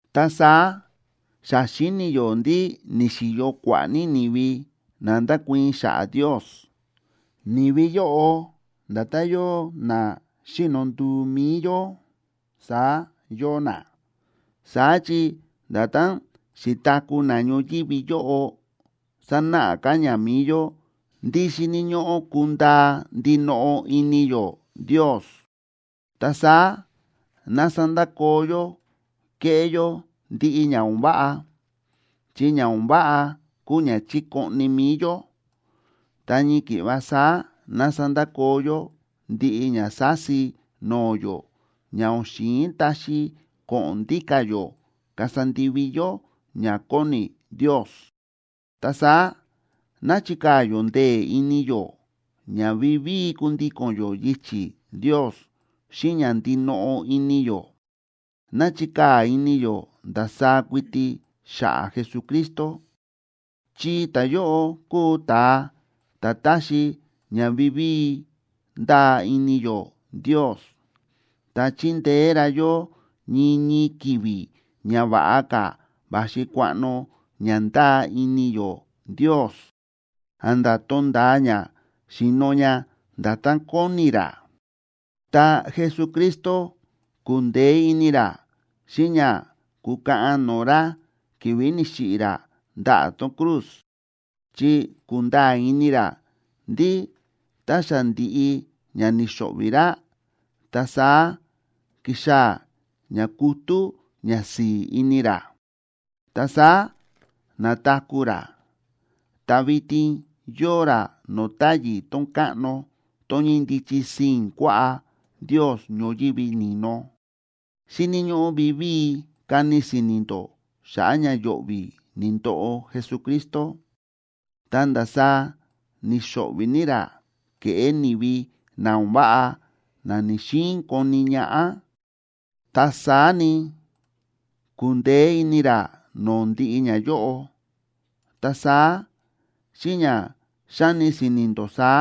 Ta saá xa xíni̱ yó ndí ni̱xi̱yo kua̱ꞌa̱ ní ni̱vi na ndákuii̱n xa̱ꞌa̱ Ndios, ni̱vi yóꞌo nda̱tán yóo na xíno nduu mi̱i yó, saá yóo na, saá chi nda̱tán xi̱taku̱ na ñoyívi yóꞌo sánáꞌa ka̱ ña mi̱i yó ndí xíni̱ ñóꞌó kundaa ndinoꞌo ini yó Ndios. Ta saá ná sandakoo yó kéꞌé yó ndiꞌi ña o̱n váꞌa, chi ña o̱n váꞌa kúu ña chíkoꞌni mi̱i yó. Ta ñii ki̱ꞌva saá ná sandakoo yó ndiꞌi ña sási no̱o̱ yó ña o̱n xi̱in taxi ko̱ꞌo̱n ndíka̱ yó kasa ndivi yó ña kóni Ndios. Ta saá ná chikaa̱ yó ndee̱ ini yó ña vivíi kundíko̱n yó yichi̱ Ndios xíꞌin ña ndinoꞌo ini yó. Ná chikaa̱ ini yó ndasaá kuiti xa̱ꞌa̱ Jesucristo, chi ta̱yóꞌo kúu ta̱a ta̱ táxi ña vivíi ndáa ini yó Ndios, ta chíndeé ra yó ñii ñii ki̱vi̱ ña va̱ꞌa ka̱ va̱xi kuaꞌno ña ndáa ini yó Ndios, a̱nda̱ tonda̱a ña xi̱no̱ ña nda̱tán kóni ra. Ta Jesucristo ku̱ndeé ini ra xíꞌin ña ku̱kaꞌan no̱o̱ ra ki̱vi̱ ni̱xiꞌi̱ ra ndaꞌa̱ tón cruz, chi ku̱nda̱a̱ ini ra ndí tá xa ndi̱ꞌi ña ni̱xo̱ꞌvi̱ ra, ta saá kixaa̱ ña kutú ñasi̱i̱ ini ra. Ta saá na̱taku̱ ra, ta vitin yóo ra no̱o̱ táyi̱ tón káꞌno tón ñíndichi sii̱n kuaꞌá Ndios ñoyívi ni̱no. Xíni̱ ñóꞌó vivíi kani si̱ni̱ ndó xa̱ꞌa̱ ña yo̱ꞌvi̱ ni̱ndoꞌo Jesucristo, ta ndasaá ni̱xo̱ꞌvi̱ ní ra ke̱ꞌé ni̱vi na o̱n váꞌa na ni̱‑xiin koni ñaꞌá, ta saá ni, ku̱ndeé ini ra no̱o̱ ndiꞌi ñayóꞌo. Ta saá, xíꞌin ña xáni si̱ni̱ ndó saá,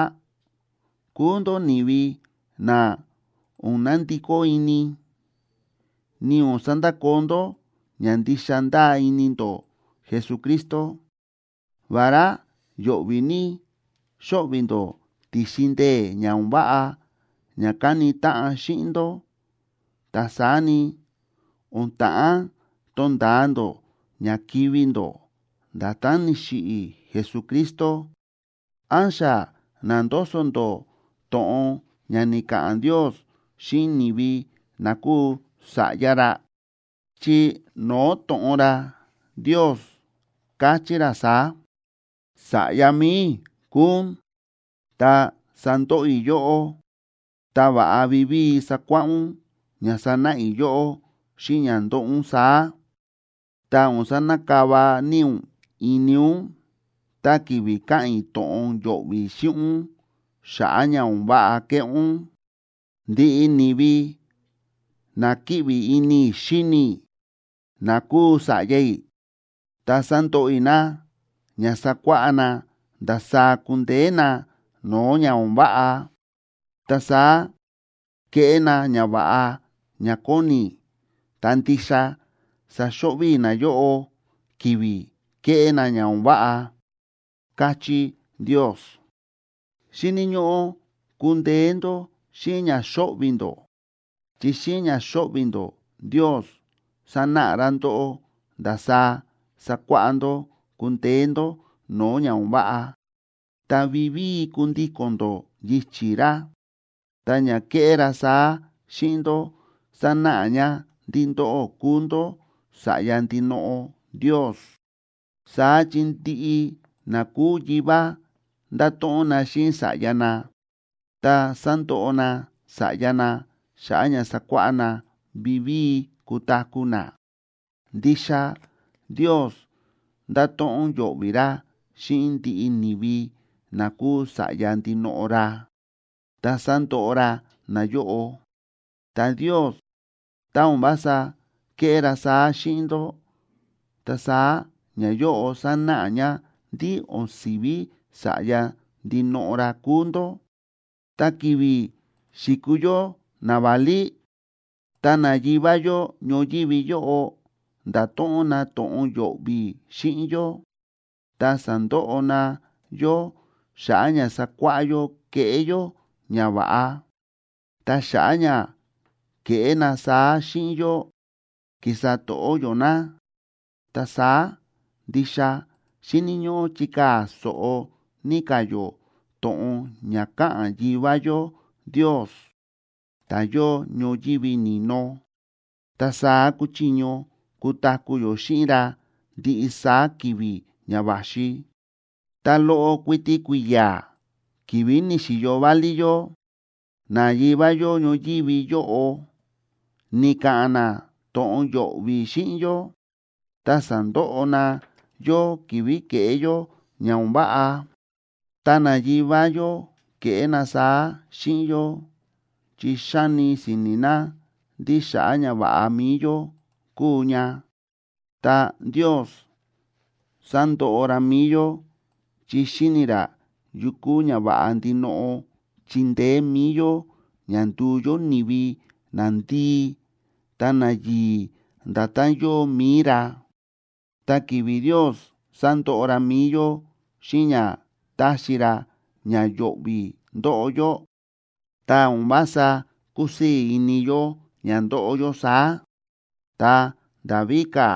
kuu ndó ni̱vi na o̱n nandikó ini, ni o̱n sandakoo ndó ña ndixa ndáa ini ndó Jesucristo. Vará yo̱ꞌvi̱ ní xóꞌvi̱ ndó ti̱xin ndee̱ ña o̱n váꞌa ña káni táꞌan xíꞌin ndó, ta saá ni, o̱n ta̱ꞌán tonda̱a ndó ña kivi̱ ndó, nda̱tán ni̱xiꞌi̱ Jesucristo. ¿Án xa na̱ndoso ndó to̱ꞌon ña ni̱ka̱ꞌa̱n Ndios xíꞌin ni̱vi na kúu sa̱ꞌya ra? Chi no̱o̱ to̱ꞌon ra, Ndios káchí ra saá: Sa̱ꞌya mi̱i i̱ kúu ún, tá sándoꞌo i̱ yóꞌó ta va̱ꞌa vivíi sakuáꞌá ún ña sánáꞌa i̱ yóꞌó xíꞌin ña ndóꞌo ún saá. Ta o̱n sanakava ní ún ini ún tá ki̱vi̱ káꞌa̱n i̱ to̱ꞌon yo̱ꞌvi̱ xíꞌin ún xa̱ꞌa̱ ña o̱n váꞌa kéꞌé ún. Ndiꞌi ni̱vi na kíꞌvi ní ini i̱ xíni i̱, na kúu sa̱ꞌya i̱, ta sándoꞌo i̱ na ña sakuáꞌá na ndasaá kundeé na no̱o̱ ña o̱n váꞌa, ta saá keꞌé na ñava̱ꞌa ña kóni i̱, ta ndixa saxo̱ꞌvi̱ i̱ nayóꞌo ki̱vi̱ kéꞌé na ña o̱n váꞌa, káchí Ndios. Xíni̱ ñóꞌó kundeé ndó xíꞌin ña xóꞌvi̱ ndó, chi xíꞌin ña xóꞌvi̱ ndó, Ndios sánáꞌa ra ndóꞌó ndasaá sakuáꞌá ndó kundeé ndó no̱o̱ ña o̱n váꞌa, ta vivíi kundíko̱n ndó yichi̱ ra, ta ña kéꞌé ra saá xíꞌin ndó sánáꞌa ña ndí ndóꞌó kúu ndó sa̱ꞌya ndinoꞌo Ndios. Saá chi ndiꞌi na kúu yivá ndáto̱ꞌon na xíꞌin sa̱ꞌya na ta sándoꞌo na sa̱ꞌya na xa̱ꞌa̱ ña sakuáꞌá na vivíi kutaku̱ na. Ndixa Ndios ndáto̱ꞌon yo̱ꞌvi̱ ra xíꞌin ndiꞌi ni̱vi na kúu sa̱ꞌya ndinoꞌo ra, ta sándoꞌo ra nayóꞌo. Ta Ndios tá o̱n vása kéꞌé ra saá xíꞌin ndó, ta saá ñayóꞌo sánáꞌa ña ndí o̱n si̱ví sa̱ꞌya ndinoꞌo ra kúu ndó. Tá ki̱vi̱ xi̱kuu yó naválí, ta nayivá yó ñoyívi yóꞌo nda̱to̱ꞌon na to̱ꞌon yo̱ꞌvi̱ xíꞌin yó, ta sa̱ndoꞌo na yó xa̱ꞌa̱ ña sakuáꞌá yó keꞌé yó ñava̱ꞌa. Ta xa̱ꞌa̱ ña ke̱ꞌé na saá xíꞌin yó, ki̱sa to̱ꞌó yó na. Ta saá ndixa xíni̱ ñóꞌó chikaa̱ so̱ꞌo ní ka̱ yó to̱ꞌon ña káꞌa̱n Yivá yó Ndios, ta̱ yóo ñoyívi ni̱no, ta saá kuchiño kutaku̱ yó xíꞌin ra ndiꞌi saá ki̱vi̱ ña va̱xi. Ta loꞌo kuiti kui̱ya̱ ki̱vi̱ ni̱xi̱yo válí yó, nayivá yó ñoyívi yóꞌo ni̱ka̱ꞌa̱n na to̱ꞌon yo̱ꞌvi̱ xíꞌin yó, ta sa̱ndoꞌo na yó ki̱vi̱ ke̱ꞌé yó ña o̱n váꞌa. Ta nayivá yó ke̱ꞌé na saá xíꞌin yó chi xáni si̱ni̱ na ndí xa̱ꞌa̱ ñava̱ꞌa mi̱i yó kúu ña. Ta Ndios sándoꞌo ra mi̱i yó chi xíni̱ ra yu kúu ñava̱ꞌa ndinoꞌo chindeé mi̱i yó ña nduu yó ni̱vi nandii ta nayi̱i̱ nda̱tán yóo mi̱i ra. Ta ki̱vi̱ Ndios sándoꞌo ra mi̱i yó xíꞌin ña táxi ra ña yo̱ꞌvi̱ ndóꞌo yó, ta o̱n vása kúsii̱ ini yó ña ndóꞌo yó saá, ta nda̱ víka̱,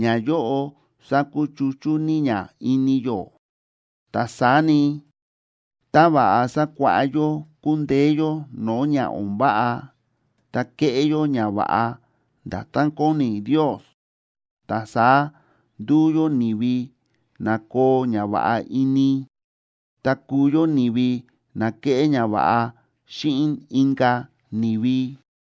ñayóꞌo sákuchuchú ní ña ini yó. Ta saá ni, tá va̱ꞌa sakuáꞌá yó kundeé yó no̱o̱ ña o̱n váꞌa ta keꞌé yó ñava̱ꞌa nda̱tán kóni Ndios, ta saá nduu yó ni̱vi na koo ñava̱ꞌa ini, ta kuu yó ni̱vi na keꞌé ñava̱ꞌa xíꞌin inka̱ ni̱vi.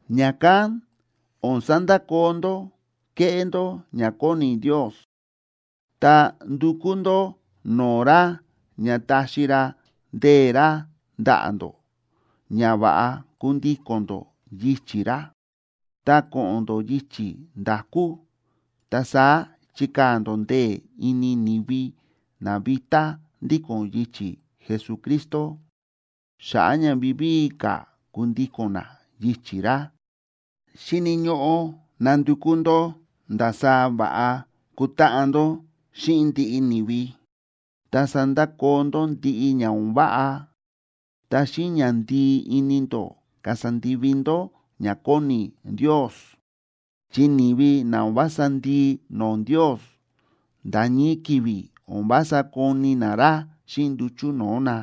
Ña̱kán o̱n sandakoo ndó kéꞌé ndó ña kóni Ndios, ta ndukú ndó no̱o̱ ra ña taxi ra ndee̱ ra ndaꞌa̱ ndó ña va̱ꞌa kundíko̱n ndó yichi̱ ra. Ta ko̱ꞌo̱n ndó yichi̱ nda̱kú, ta saá chikaa̱ ndó ndee̱ ini ni̱vi na vitá ndíko̱n yichi̱ Jesucristo, xa̱ꞌa̱ ña vivíi ka̱ kundíko̱n na yichi̱ ra. Xíni̱ ñóꞌó nandukú ndó ndasaá va̱ꞌa kutáꞌan ndó xíꞌin ndiꞌi ni̱vi. Ta sandakoo ndó ndiꞌi ña o̱n váꞌa, ta xíꞌin ñandii ini ndó kasa ndivi ndó ña kóni Ndios, chi ni̱vi na o̱n vása ndii no̱o̱ Ndios, nda̱ ñii ki̱vi̱ o̱n vása koni na ra xíꞌin nduchu̱ no̱o̱ na.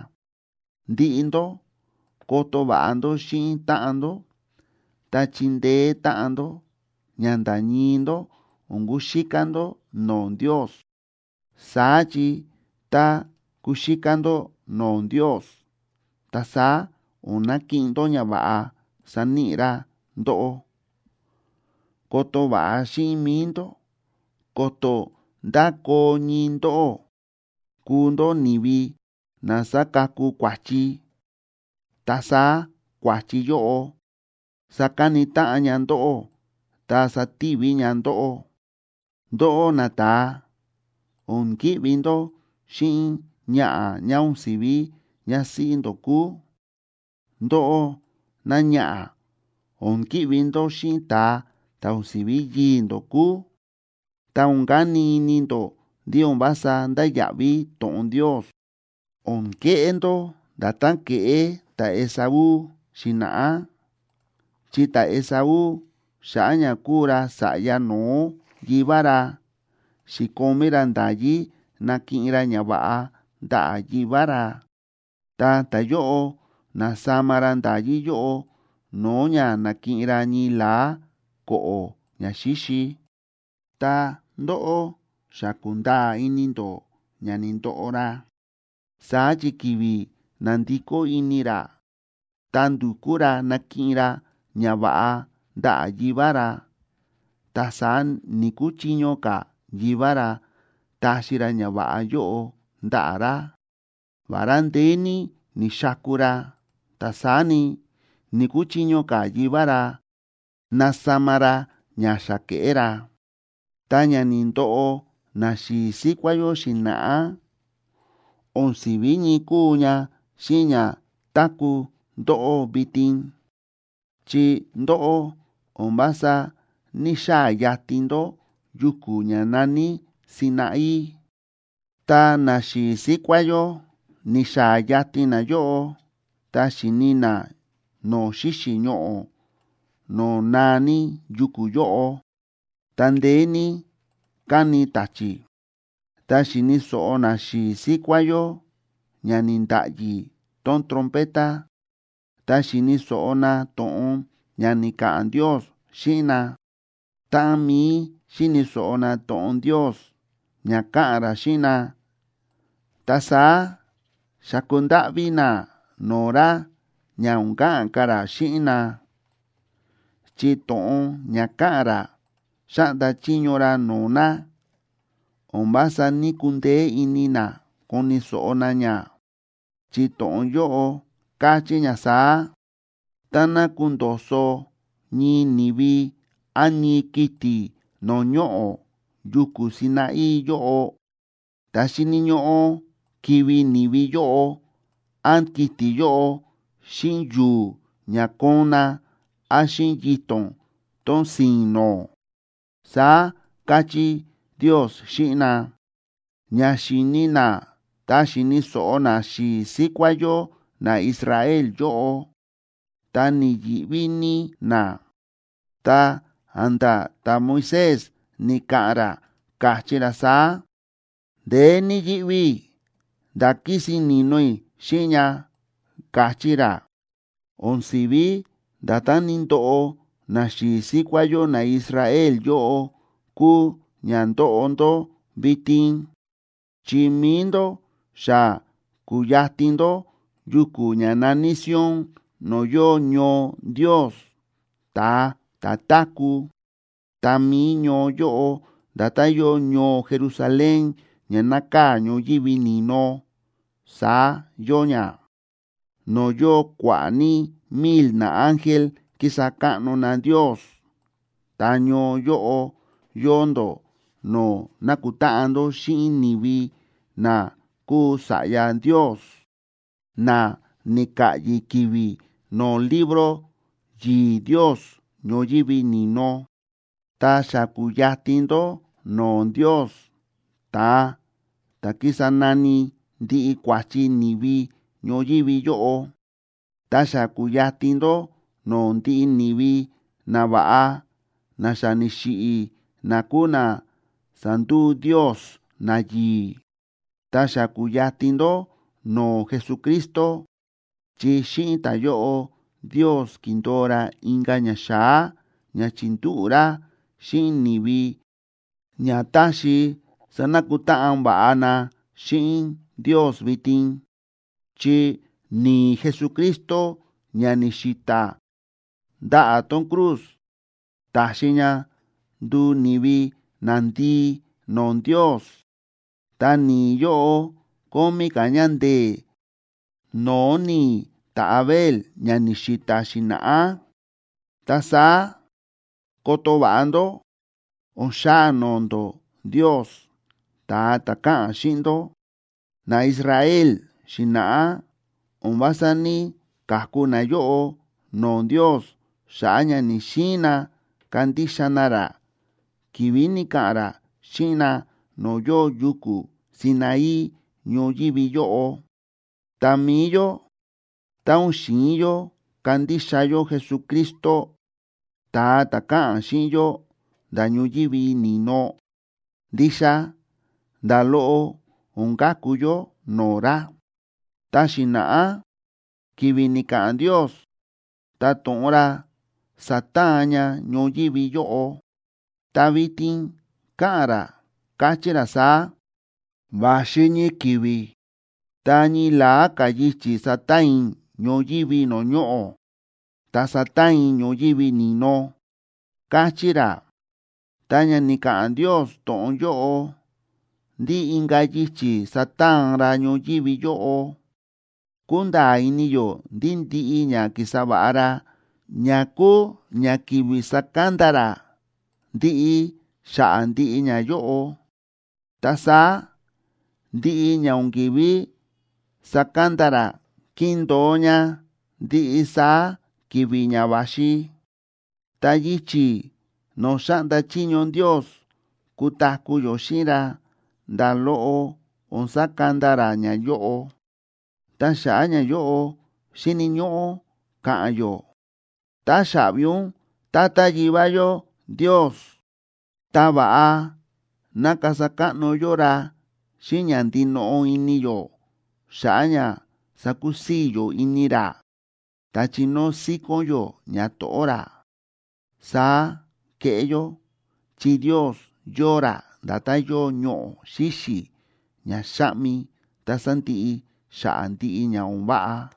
Ndiꞌi ndó, koto va̱ꞌa ndó xíꞌin táꞌan ndó ta chindeé táꞌan ndó ña nda̱ ñii ndó o̱n kuxíká ndó no̱o̱ Ndios, saá chi tá kuxíká ndó no̱o̱ Ndios, ta saá o̱n nakiꞌin ndó ñava̱ꞌa saníꞌi ra ndóꞌó. Koto va̱ꞌa xíꞌin mi̱i ndó ko̱to̱ ndá koo ñii ndóꞌó kuu ndó ni̱vi na sakaku kua̱chi, ta saá kua̱chi yóꞌo sakani táꞌan ña ndóꞌó ta sativi ña ndóꞌó. Ndóꞌó nata̱a, o̱n ki̱ꞌvi ndó xíꞌin ñaꞌa̱ ñá o̱n si̱ví ñásíꞌí ndó kúu. Ndóꞌó náñaꞌa̱, o̱n ki̱ꞌvi ndó xíꞌin ta̱a ta̱ o̱n si̱ví yii̱ ndó kúu. Ta o̱n kani ini ndó ndí o̱n vása ndáya̱ꞌví to̱ꞌon Ndios, o̱n keꞌé ndó nda̱tán ke̱ꞌé ta̱Esaú xi̱na̱ꞌá, chi ta̱Esaú xa̱ꞌa̱ ña kúu ra sa̱ꞌya no̱ó yivá ra xi̱komí ra nda̱yí nakiꞌin ra ñava̱ꞌa ndaꞌa̱ yivá ra, ta ta̱yóꞌo na̱sama ra nda̱yí yóꞌo no̱o̱ ña nakiꞌin ra ñii la̱á ko̱ꞌo̱ ñaxíxi. Ta ndóꞌó xa ku̱nda̱a̱ ini ndó ña ni̱ndoꞌo ra, saá chi ki̱vi̱ na̱ndikó ini ra ta ndu̱kú ra nakiꞌin ra ñava̱ꞌa ndaꞌa̱ yivá ra, ta saá ni̱‑kuchiño ka̱ yivá ra taxi ra ñava̱ꞌa yóꞌo ndaꞌa̱ ra. Vará ndeé ní ni̱xaku ra, ta saá ni, ni̱‑kuchiño ka̱ yivá ra nasama ra ña xa ke̱ꞌé ra. Ta ña ni̱ndoꞌo naxi̱i̱ síkuá yó xi̱na̱ꞌá o̱n si̱ví ñii kúu ña xíꞌin ña táku̱ ndóꞌó vitin. Chi ndóꞌó o̱n vása ní‑xaa̱ yatin ndó yuku̱ ña na̱ní Sinaí, ta naxi̱i̱ síkuá yó ni̱xaa̱ yatin nayóꞌo ta xi̱ni na no̱o̱ xíxi̱ ñoꞌo̱ no̱o̱ naa ní yuku̱ yóꞌo, ta ndeé ní káni ta̱chi̱. Ta xi̱ni̱ so̱ꞌo naxi̱i̱ síkuá yó ña ni̱nda̱ꞌyi tón trompeta, ta xi̱ni̱ so̱ꞌo na to̱ꞌon ña ni̱ka̱ꞌa̱n Ndios xíꞌin na. Táꞌan mií xíni̱ so̱ꞌo na to̱ꞌon Ndios ña káꞌa̱n ra xíꞌin na, ta saá xa̱ku ndáꞌví na no̱o̱ ra ña o̱n ka̱ꞌa̱n ka̱ ra xíꞌin na, chi to̱ꞌon ña káꞌa̱n ra xáꞌnda chiño ra no̱o̱ na, o̱n vása ní‑kundeé ini na koni̱ so̱ꞌo na ña, chi to̱ꞌon yóꞌo káchí ña saá: “Táná kundo̱so̱ ñii ni̱vi án ñii kiti̱ no̱o̱ ñoꞌo̱ yuku̱ Sinaí yóꞌo, ta xíni̱ ñóꞌó kivi̱ ni̱vi yóꞌo án kiti̱ yóꞌo xíꞌin yu̱u̱ ña koon na, án xíꞌin yito̱n tón si̱i̱n nó”, saá káchí Ndios xíꞌin na. Ña xi̱ni na ta xi̱ni̱ so̱ꞌo naxi̱i̱ síkuá yó naIsrael yóꞌo, ta ni̱yi̱ꞌví ní na, ta a̱nda̱ ta̱Moisés ni̱ka̱ꞌa̱n ra, káchí ra saá: “Ndeé ní yíꞌví i̱ nda̱ kísin ni̱no i̱ xíꞌin ña”, káchí ra. O̱n si̱ví nda̱tán ni̱ndoꞌo naxi̱i̱ síkuá yó naIsrael yóꞌo kúu ña ndóꞌo ndó vitin, chi mi̱i ndó xa ku̱yatin ndó yuku̱ ña na̱ní Sion no̱o̱ yóo ñoo Ndios, ta̱a ta̱ táku̱. Ta mi̱i ñoo yóꞌo nda̱tán yóo ñoo Jerusalén ña nákaa̱ ñoyívi ni̱no, saá yóo ña, no̱o̱ yóo kua̱ꞌa̱ ní mil naángel kísa káꞌno na Ndios. Ta ñoo yóꞌo yóo ndó no̱o̱ nákutáꞌan ndó xíꞌin ni̱vi na kúu sa̱ꞌya Ndios, na ni̱ka̱ꞌyi̱ ki̱vi̱ no̱o̱ libro yi̱i̱ Ndios ñoyívi ni̱no. Ta xa ku̱yatin ndó no̱o̱ Ndios, ta̱a ta̱ kísa nani ndiꞌi kua̱chi ni̱vi ñoyívi yóꞌo, ta xa ku̱yatin ndó no̱o̱ ndiꞌi ni̱vi nava̱ꞌa na xa ni̱xiꞌi̱ na kúu na sa̱nduu Ndios nayi̱i̱. Ta xa ku̱yatin ndó no̱o̱ Jesucristo, chi xíꞌin ta̱yóꞌo Ndios ki̱ndo̱o ra inka̱ ñaxa̱á ña chi̱ndúꞌu̱ ra xíꞌin ni̱vi ña taxi sanakutáꞌan va̱ꞌa na xíꞌin Ndios vitin. Chi ni̱i̱ Jesucristo ña ni̱xi̱ta̱ ndaꞌa̱ tón cruz ta̱xi ña nduu ni̱vi nandii no̱o̱ Ndios, ta ni̱i̱ yóꞌo kómí ka̱ ña ndee̱ no̱o̱ ni̱i̱ ta̱Abel ña ni̱xi̱ta̱ xi̱na̱ꞌá. Ta saá koto va̱ꞌa ndó, o̱n xaa no̱o̱ ndó Ndios, ta̱a ta̱ káꞌa̱n xíꞌin ndó. NaIsrael xi̱na̱ꞌá o̱n vása ní‑kaku nayóꞌo no̱o̱ Ndios xa̱ꞌa̱ ña ni̱‑xiin na kandixa na ra, ki̱vi̱ ni̱ka̱ꞌa̱n ra xíꞌin na no̱o̱ yóo yuku̱ Sinaí ñoyívi yóꞌo. Ta mi̱i yó, tá o̱n xi̱in yó kandixa yó Jesucristo, ta̱a ta̱ káꞌa̱n xíꞌin yó nda̱ ñoyívi ni̱no, ndixa nda̱ loꞌo o̱n ka̱ku yó no̱o̱ ra. Ta xi̱na̱ꞌá ki̱vi̱ ni̱ka̱ꞌa̱n Ndios, ta to̱ꞌon ra sa̱taan ña ñoyívi yóꞌo, ta vitin káꞌa̱n ra, káchí ra saá: “Va̱xi ñii ki̱vi̱, ta ñii la̱á ka̱ yichi̱ sataan i̱ ñoyívi no̱o̱ ñoꞌo̱, ta sataan i̱ ñoyívi ni̱no”, káchí ra. Tá ña ni̱ka̱ꞌa̱n Ndios to̱ꞌon yóꞌo ndí inka̱ yichi̱ sataan ra ñoyívi yóꞌo, kúnda̱a̱ ini yó ndí ndiꞌi ña ki̱sa va̱ꞌa ra ña kúu ña kivi sakanda ra, ndiꞌi xa̱ꞌa̱ ndiꞌi ñayóꞌo. Ta saá ndiꞌi ña o̱n kívi sakanda ra kindo̱o ña ndiꞌi saá ki̱vi̱ ña va̱xi. Ta yichi̱ no̱o̱ xáꞌnda chiño Ndios kutaku̱ yó xíꞌin ra, nda̱ loꞌo o̱n sakanda ra ñayóꞌo. Ta xa̱ꞌa̱ ñayóꞌo xíni̱ ñóꞌó ka̱ꞌa̱n yó: “Táxaꞌvi ún, Tata Yivá yó Ndios”, ta va̱ꞌa ná kasa káꞌno yó ra xíꞌin ña ndinoꞌo ini yó xa̱ꞌa̱ ña sakusii̱ yó ini ra, ta chinóo síkón yó ñato̱ꞌó ra. Saá keꞌé yó, chi Ndios yóo ra nda̱tán yóo ñoꞌo̱ xíxi̱ ña xáꞌmi ta sándiꞌi xa̱ꞌa̱ ndiꞌi ña o̱n váꞌa.